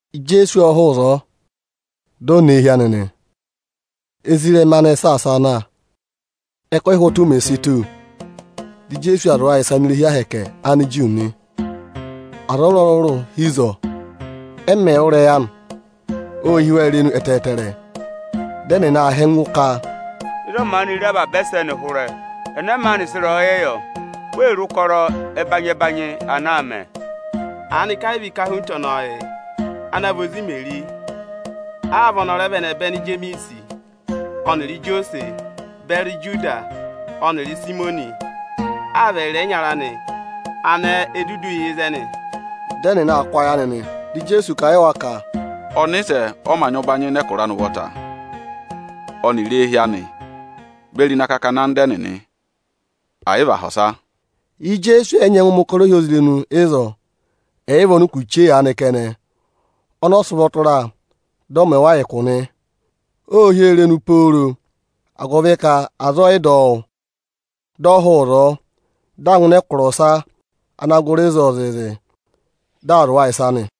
Ijeesu ộ hụụ ịzọọ, dị ọ nọ eehi anị nị. Ezirẹma anị ệ saasa a na. Ẹkụhị ụhwọtụ mè si tù, dị Ijeesu aa zụ̀ aza ịsa ini irehi ahẹkẹ Aniju nị. Aza ọrụrụ-ọrụrụ hi ịzọọ. Ẹ mẹ̀ wụ́ ịrẹyị anị, ô hí wa irenu ẹtẹẹtẹrẹ. Dị ẹnịnị aa họ̀ ẹngụ ka, “Ịzọọ maanị re avaba ẹsẹnị hụrẹ? Ẹnẹ maanị sị ịrẹyọyẹ yọ? Wee re ụkọrọ ẹbanyị-ẹbanyị ana aa mẹ! Aanị ka ẹ yị vị ikahunta ọnọọ yị, ana vị ozi Imeri? Aa vị ọnị ọ rẹ vị ẹnẹbẹnị Ijemiisi ọnịrị Ijosẹsị beri Ijudasi ọnịrị Ịsayịmọnị? Aa vị ẹyịrị ẹyịnyara anị anẹẹ e dudu yà ịzẹnị?” Dị ẹnịnị aa kụ́ ayị anị nị. Dị Ijeesu kà a yị wa ka, “Ọnịsẹ ọ mā nyị ụbanyị ịnị ẹkụra anị ụvọta ọnịrị éehi anị beri ịnị akakana anda ẹnịnị, ẹ̀ yị vị aha ọsa.” Ijeesu ọ yị nyẹngụ mẹ̀ ụkọrọ ohyozirenu ịzọọ, ẹ̀ yị vị ọnịkụ chee aanị kẹnẹ, ọnị ọ sị ụvọ tụra, dị ọ mẹ wa ụkụ nị. Ô hí oo irenu pooro, agụvị ka aza ẹ yị dọ wụ́. Dị ọ hụụ ịzọọ, dị aa ngụ ịnị ẹkụra ọsa ana gụrị ịzọọ zịịzị, dị aa zụ̀ wa ịsa nị.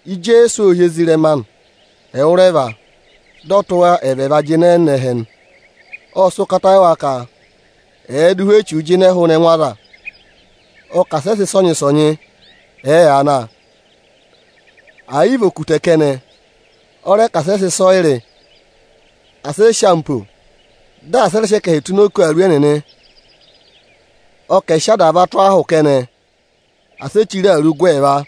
Ijeesu ộ hị́ ezirẹma anị ẹwụrẹva, dị ọ tụ́ wa ẹvẹẹva jịnẹ nọ ẹhẹ nị. Ộ sị ụkata yị wa ka ẹ̀ẹ dụ ụhwẹ echuu jịnẹẹ hụụnị ẹngụ aza. Ọ kà asị ẹ sị ịsọnyị-ịsọnyị ẹ̀ẹ yaa na, ẹ̀ yị vị okutẹ kẹnẹ; ọ rẹ ka asị ẹ sị ịsọyịrị, asị ẹ sị ampo, dị asị ẹ rẹ sị ẹkẹhị tụ́ ini oku awuru ẹnịnị. Ọ kà ẹ̀ sị adava tụ́ ahụ kẹnẹ; asị e chire awuru gụ ẹẹva.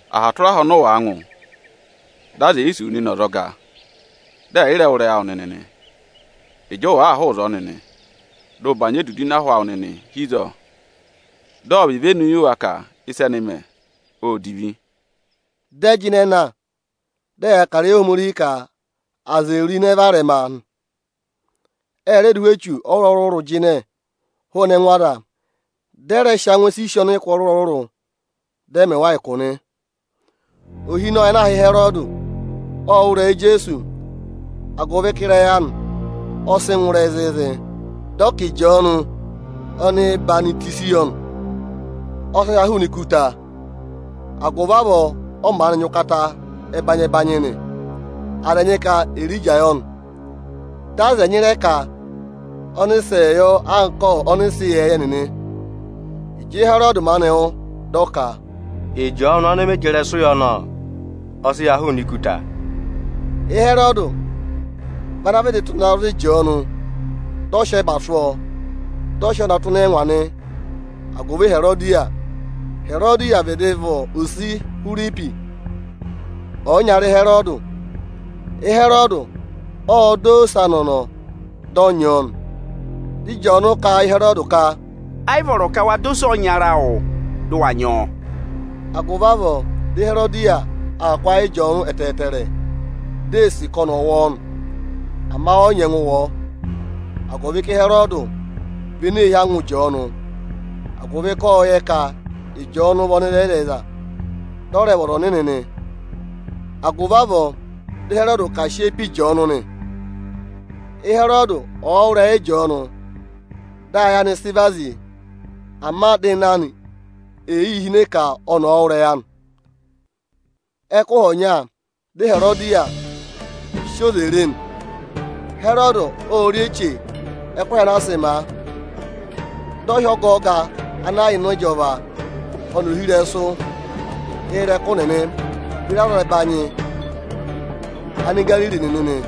Aha tụra aha ọnị ụ wàa ngụ, dị aza è yi sì wu nịnị ọzọga, dị ẹ̀ yị rẹ wụ́ ịrẹyị awụ nịnị nị, ịjị ụ wàa hụụ ịzọọ nịnị, dị ụ bànyị edudu ịnị ahụ awụ nịnị hi ịzọọ, dị ọ̀ vị ivenu yị wa ka ịsị ẹnẹ ẹ mẹ, ô divi.” Dị ẹ jịnẹ na, dị ẹyaa kà ịrẹyị Ohomorihi ka aza è ro ịnẹ varẹma nị. Ẹ rẹ dụ ụhwẹ echu ọrụrụ-ọrụrụ jịnẹ hụụnị ẹngụ aza. Dị ẹ rẹ sị angwẹ sisi ọnịkụ ọrụrụ-ọrụrụ ịrẹsụ, dị ẹ mẹ wa ụkụ nị. Ohinọyị ana aā hị́ Ịhẹrọdị ộ wụ́ ịrẹyị Ijeesu, agụvị ka ịrẹyị anị ọ sị ngụ ịrẹyị zịịzị. Dị ọ ka Ịjọọnụ ọhwọzenyi yọ nị, ọ sị ha hụụnị ikuta; agụvị avọọ ọ maanị nyị ụkata ẹbanyị-ẹbanyị nị. Aza ẹnyị ka Erija yọ nị. Dị aza ẹnyị rẹ ka ọnịsẹẹ yọ anka ọnịsẹ ịyẹẹyẹ nịnị. Ịjị Ịhẹrọdị maanị wụ́, dị ọ ka, “Ịjọọnụ ọnị mị jị ịrẹsụ yọ nị! Ọ sị ha hụụnị ikuta.” Ịhẹrọdị vị ana vịdị tụ́ na za Ịjọọnụ, dị ọ sị ẹba sụ́ ọọ, dị ọ sị ọọ na tụ́ ịnị ẹngwa nị agụvị Iherodiya. Iherodiya vịdị vị ose Ihwiripi, ọyịnyara Ịhẹrọdị. Ịhẹrọdị ộ dọ Ihwiripi ose anị ọnọọ, dị ọ nyị ọọ nị. Dị Ịjọọnụ kà a yị Ịhẹrọdị ka, “Ẹ yị vọrọ ka wa dọ ose ọyịnyara awụ, dị ụ wa nyị ọọ.” Agụvị avọọ dị Iherodiya aa kụ́ ayị Ịjọọnụ ẹtẹẹtẹrẹ, di ee sì ka ọnị ọ̀ wụ ọọ nị. Ama ọ yị nyẹngụ wụ ọọ, agụvị ka Ịhẹrọọdụ vị ene ee hí angwa Ịjọọnụ, agụvị ka ộ yẹ ka Ịjọọnụ vị ọnịrẹyịzẹyịza, dị ọ rẹ vị ọza ọnịnị nị. Agụvị avọọ dị Ịhẹrọdị ka à sị eyi pe Ịjọọnụ nị. Ịhẹrọdị ọ̀ọ wụ́ ịrẹyị Ịjọọnụ, dị ayị anị sị vazi, ama dị ịnẹ anị ee yii hine ka ọnị ọ̀ wụ́ ịrẹyị anị. Ẹkụhị ọnya dị Iherodiya sị oze re nị. Ịhẹrọdị ộ rị eche ẹkụhị anaa sị ma a. Dị ọ hị́ ọgọọga ana yà ịnị ịjọva, ọnịrị ọga isoja nịnị beri azẹbanyị Anigariri nịnị nị.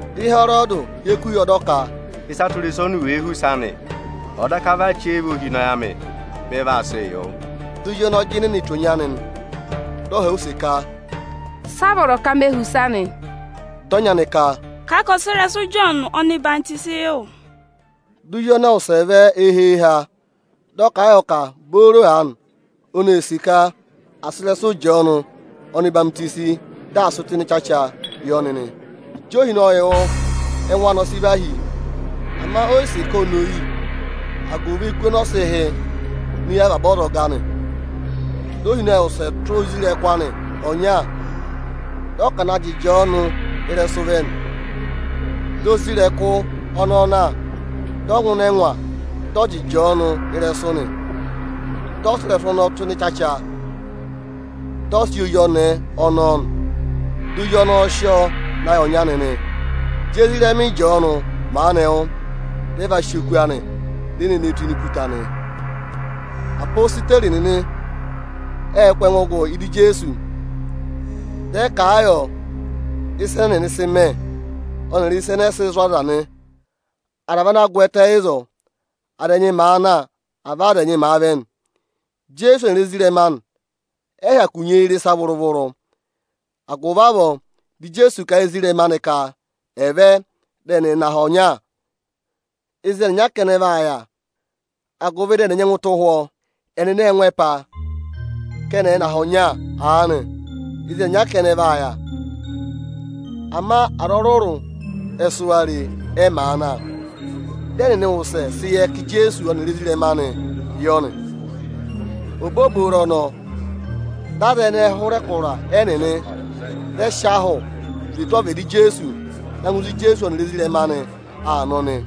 Dị Ịhẹrọdị hyeku yọ, dị ọ ka: Ịsa tụra ịsa oni òo họ̀ use anị, ọ̀ọ daka vị achẹva ohinọyị anị, ọnị vaa sịị yọ nị. Dị ozi ọnọọ jịnẹ ne tù ọnyị anị, dị ọ họ̀ ọ use ka, “Sị a vọrọ ka me họ̀ use anị?” Dị ọnyị anị ka, “Kàa ka ọ̀ sị ịrẹsụ Ịjọọnụ ọhwọzenyi yị wụ!” Dị ozi ọnọọ wụsẹ vẹ eyiha-eyiha, dị ọ kà a yọ ka booro aanị oni ee sì ka à sị ịrẹsụ Ịjọọnụ ọhwọzenyi, dị à sị tụ́ ịnị ịchacha yị ọnị. Ịjị ohinọyị wụ́, ẹngụ anị ọ sị và hí. Ama o yi sì ka oni ò yi, agụvị eku ọnọọ sị hị́ ini eyi avaba azọga anị. Dị ohinọyị wụsẹ tụ́ isoja anị ọnya, dị ọ ka ọ̀ na jị Ịjọọnụ ịrẹsụ vẹ nị. Dị isoja ọnọọ na, dị ọ ngụ ịnị ẹngwa, dị ọ jị Ịjọọnụ ịrẹsụ nị. Dị ọ sị ịrẹsụ ọnọọ tụ́ ịnị ịchacha, dị ọ sị yị ozi ọnẹẹ ọnọọ nị. Dị ozi ọnọọ sị ọọ na yị ọnyị anị nị. Ịjị ezirẹma Ịjọọnụ maanị wụ́, dị ẹ va sị oku anị, di e ne ne e tụ́ ini ikuta nị. Apositeri nịnị ệ kụ́ ẹngụ gụ ị́dị Ijeesu. Dị ẹ kà a yọ ịsa ẹnẹ ẹnịnị sị mẹ, ọnịrị ịsa ẹnẹẹ sị zụ̀ aza nị. Aza vị ana gwẹtẹ ịzọọ. Aza ẹnyị màa na, avọọ aza ẹnyị màa vẹ nị. Ijeesu ọnịrị ezirẹma anị ẹ yị hyakụ nyị eyi rị ịsa vụrụ-vụrụ. Agụvị avọọ dị Ijeesu kà a yị ezirẹma anị ka ẹ̀ vẹ, dị ẹnị ẹ̀ nọ aha ọnya ịzị ẹnịnya kẹnẹ vaa yà, agụvị dị ẹnị ẹ̀ nyẹngụ tụ́ ụhwọ́ nị. Ẹnịnị ệ ngụ ẹpa, ka ẹnị ẹ̀ nọ aha ọnya aanị ịzị ẹnịnya kẹnẹ vaa yà. Ama aza ọrụrụ ẹ sị wa re, ẹ màa na. Dị ẹnịnị wụsẹ sị yẹ ka Ijeesu ọnịrị ezirẹma anịị yọ nị. Obooboro ọnọọ, dị aza ẹnẹẹ hụrẹ ẹkụra ẹnịnị, dị ẹ sị ahụ zwe tụ́ ọvịdị Ijeesu na ngụ ịzị Ijeesu ọnịrị ezirẹma anị aa nọ nị.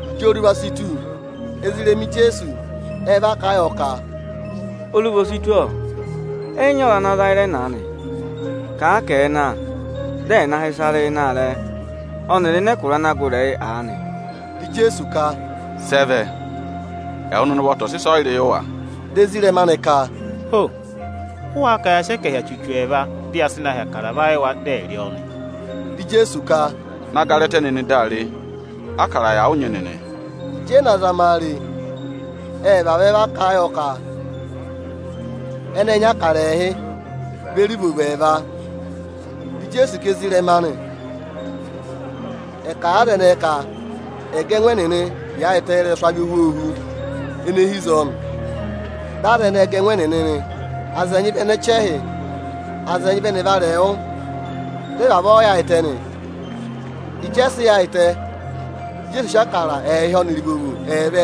Ịjị oruva si tù, ezirẹma Ijeesu ẹ va kà a yọ ka, “Oruva o si tù ọ, ẹ yị nyị aza ana ra ịzẹnị. Kà a ka ẹ̀ẹ na, dị ẹ̀ na hị́ ịsa rị ịnị aarẹ ọnịrị ịnị ẹkụra ana gụrị ẹyị aanị!” Dị Ijeesu ka, “Sị ẹ vẹ? Ẹwụ nịnị ụvọta ọ̀ sị ịsọyịrị yị wa!” Dị ezirẹma anị ka, “Ho! Ụ wáá ka ya sị ẹkẹhị achuchu ẹẹva, dị ya sị na hị́ Ịbụrẹẹdị va yị wa, dị ẹ̀ rị ọọ nị?” Dị Ijeesu ka, “Na gara ẹtẹ nịnị daa re, ákara yà ụ nyị nịnị!” Ịjị ẹ na gara ẹtẹ re, ệ vavẹ va kà a yọ ka ẹnị ệ nyị Ịbụrẹẹdị ẹẹhị beri ivovo ẹẹva. Dị Ijeesu ka ezirẹma anị ẹ̀ kà a yị aza ẹnẹẹ ka ẹ̀ ga ẹngụ ẹnịnị yaayịtẹ ị́rẹsụ avị ohwoohu ene hi ịzọọ nị. Dị aza ẹnẹẹ ga ẹngụ ẹnịnị nị: Aza ẹnyị vị ẹnị ẹchẹhị, aza ẹnyị vị ẹnị ẹvarẹwụ, dị ẹ vavọọ yaayịtẹ nị. Ịjị ẹ sị yaayịtẹ, dị Ijeesu sị Ịbụrẹẹdị ẹẹhị ọnịrị ivovo ẹẹva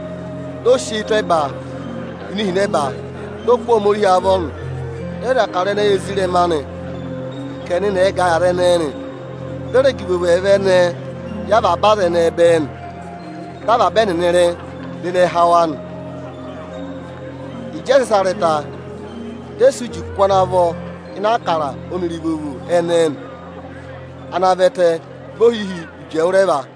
ẹnẹẹ nị. Ộ kụ̀rà eyi tụ́ ẹba re ihinẹba, dị ọ kụ́ Ohomorihi avọ nị. Ộ dà Ịbụrẹẹdị ọnọọ yị ezirẹma anị ka ẹnịnị ẹ̀ gà ẹ yị aza ẹnẹẹ. Dị ọ rẹ gà ivovo ẹẹva ẹnẹẹ yị avaba aza ẹnẹẹ bẹẹ nị. Dị avaba ẹnịnị rị, dị ịnẹ há wa nị. Ịjị ẹ sị ịsa rị ta, dị ẹ sị uji kụ́ ana vọ ịnị Ịbụrẹẹdị ọnịrị ivovo ẹnẹẹ nị. Ana vẹtẹ vị ohihi uji ẹwụrẹva.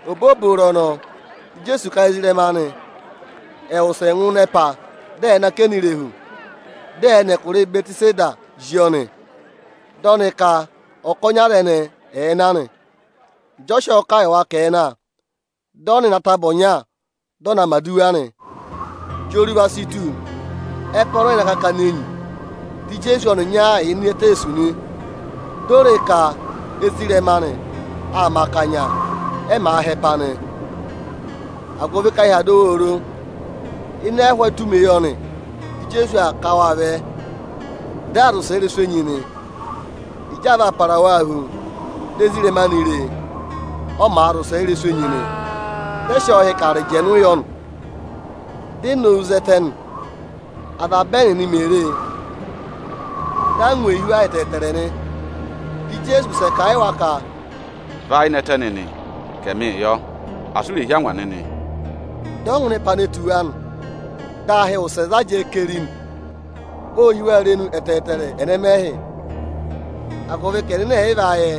Obooboro ọnọọ, dị Ijeesu ka ezirẹma anị ẹ̀ wụsẹ ngụ ịnị ẹpa, dị ẹ̀ nọ akẹnẹ irehu, dị ẹ̀ẹ nọ ẹkụra Ịbẹtịsedaa zí ọnị; dị ọ ka ọkọnị aza ẹnẹẹ ẹ̀ẹ na nị. Ịjị ọ sị ọọ kà yị wa ka ẹ̀ẹ na, dị ọ nọ ịnị ataba ọnya, dị ọ naa mẹ̀ aduwa nị. Ịjị oruva si tù, ẹpa ọnọọ yà ịnị akakana enyi, dị Ijeesu ọnịnya yà ini eteesu nị. Di o re ka ezirẹma anị aa mẹ akanya, ẹ màa họ̀ ẹpa nị, agụvị ka ahị aa dọ wa oro. Ịnị ẹhụụ etumeyọnị dị Ijeesu aa ká waa vẹ; dị aa zị ụsẹ ị́rẹsụ enyi nị. Ịjị aa vaa para waa hu, di ezirẹma anị re e, ọ màa zị ụsẹ ị́rẹsụ enyi nị. Ẹnịnị ẹ sị ọọ hị́ ka arịjẹnụ yọ nị, di e nowu zẹtẹ nị. Avaba ẹnịnị mè re e, dị angwa ee hí wa ẹtẹẹtẹrẹ nị. Dị Ijeesu wụsẹ kà a yị wa ka, “Và ayị nẹtẹ nịnị, ka ẹmịị yọ nị! Asị u rè hí angwa nịnị!” Dị ọ ngụ ịnị ẹpa ne tù wa nị, dị ahị wụsẹ za jẹẹ keri nị. Ô hí wa irenu ẹtẹẹtẹrẹ ẹnẹmẹhị, agụvị ka ẹnịnị ẹ̀ yị va yẹ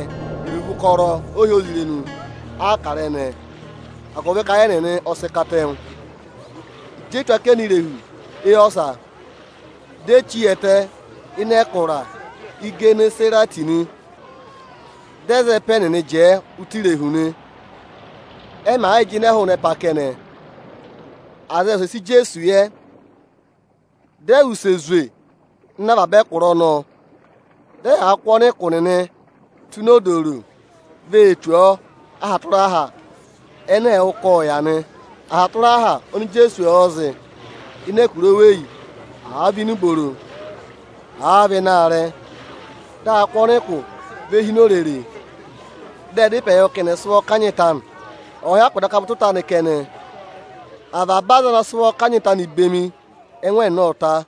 iruvo ụkọrọ ohyozirenu Ịbụrẹẹdị ẹnẹẹ, agụvị ka ayị ẹnịnị ọ sị katẹngụ. Ịjị e tù akẹnẹ irehu éyi ọsa, di e chí hi ẹtẹ ịnị ẹkụra Igenesarẹtị nị. Dị ẹ za ẹpa ẹnịnị jẹẹ ụtọ irehu nị. Ẹ màa yịị jịnẹẹ hụụnị ẹpa kẹnẹ, aza ệ wụsẹ sị Ijeesu yẹ. Dị ẹ wụsẹ zwe ngụ avaba ẹkụra ọnọọ zị, dị ẹyaa kụ́ ọnịkụ nịnị ị tụ́ ini odooro vee tù ọọ aha tụra aha ẹnẹ ẹ̀ẹ wụ́ ka ộ yà nị. Aha tụra aha oni Ijeesu ọ̀ọ zị ịnị ẹkụra oweyi, àa vị ịnị ẹkụra ọbanyị, àa vị ịnị aarẹ, dị a kụ́ ọnịkụ ve hi ini orere. Ệ dá ịpẹ yọ ka ọ̀ọ hyakụ daka vị ụtọ ịta anị kẹnẹ ẹnịnị ẹ̀ sị ụvọ kanyị ọ. Avaba aza ana sị ụvọ kanyị ọọ bemi, ẹngụ ẹnịnị ộ ta.